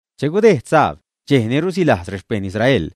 Che gudejd sabd, dxej ni rusilajz rexpejṉ Israel,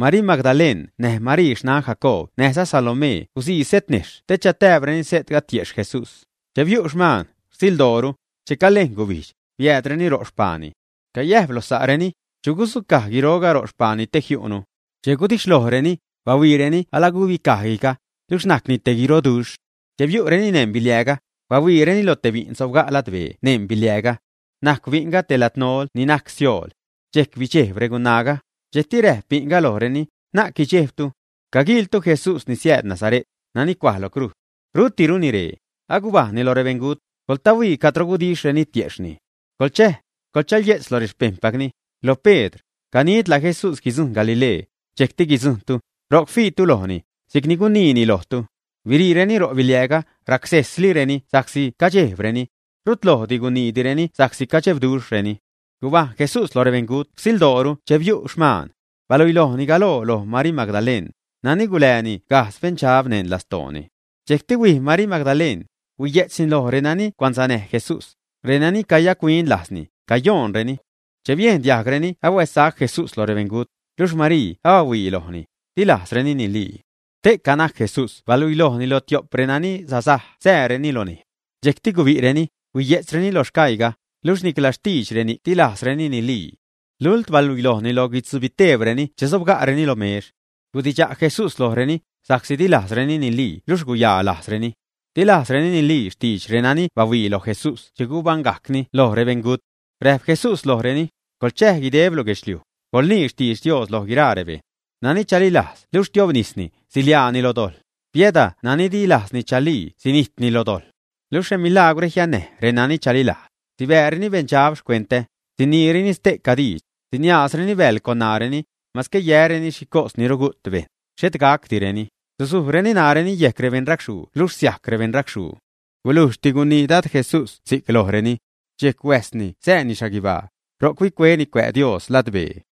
Marii Magdaleṉ näj Marii xnan Jacoob näjza Salomee gusii setnejxh te chatääbreni se'tga tiexh Jesús. Che biu' xmaan, rsildooru, che calejn gubijdx, biäädreni ro' xpaani. Cayäjp loj sa'reni: ―¿Chu gudzucaj guiroga ro' xpaani te jiu'nu? Che gudixhlojreni, bahuiireni alagubicaj guijga, luxh najcni te guiroduxh. Che biu'reni neṉ biliääga, bahuiireni lo te bi'n sobga' ladbee neṉ biliääga. Najcw bi'nga te ladnol ni najc siool. Dxejc bidxejb regunaaga. Dxejcti räjp bi'nga lojreni: ―Na'c guidxejbtu. Caguiiltu Jesús ni siääd Nazare't, nani cuaj lo crujz. Rutiruni ree. Agubajṉni lo rebeṉgut, coḻtahuii cadro gudixhreni tiejxhni. Coḻchäj, coḻchaye'tz lo rexpejṉpacni, loj Pedr, ganidla Jesús guidzujṉ Galilee, dxejcti guidzujṉtu. Ro'c fiitu lojni, si'cni guniini lojtu. Biriitireni ro' biliääga, racsejslireni sa'csi cadxejbreni. Rut lojdi guniidireni sa'csi cadebduxhreni. Gubajṉ Jesús loj rebeṉgut rsildooru che biu' xmaan. Baluilojni galoo loj Marii Magdaleṉ, nani agacgulääni gajdz beṉdxab neṉ lastooni. Dxejcti huij Marii Magdaleṉ, huiye'tzni loj renani cuansanäj Jesús, renani cayac-huin lajzni, cayoonreni. Che biejn diajgreni ahuäzsac Jesús lo rebeṉgut, luxh Marii abahuii lojni, di lajzreni nilii. Ste'ca najc Jesús baluilojni loj tio'p renani sasaj sääreni lo nejz. Dxejcti gubi'reni, huiye'tzreni loj sgaiiga, luxh nicla xtidx reni'c di lajzreni nilii. Lult baluilojni loj guitzubiteebreni che sobga'reni lo mex. Gudidxa' Jesús lojreni, sa'csi di lajzreni nilii luxh guyaa lajzreni. Di lajzreni nilii xtidx renani bahuii loj Jesús che gubaṉgajcni loj rebeṉgut. Räjp Jesús lojreni: ―Coḻchäj guideb lo guedxliuj, coḻnii xtidx Dios lo guiraa rebejṉ. Nani chalilajz luxh tiobnisni, siḻiaani loj dojḻ; biäda nani di lajzni chalii sinijtni lo dojḻ. Niluxh remilagwre jiannäj renani chalilajz: sibääreni beṉdxab xcuentä; siniireni ste'ca diidx; guiniaazreni bäḻ con ṉaareni; masque yäreni xhicos ni rugu't bejṉ, xhet gacdireni; susujreni ṉaareni yejc rebeṉracxhuu luxh siajc rebeṉracxhuu. Gulujxti gunii Dad Jesús si'c lojreni. Dxejc huäjsni sääni xhaguibaa. Ro'c huicueni cuä' Dios ladbee.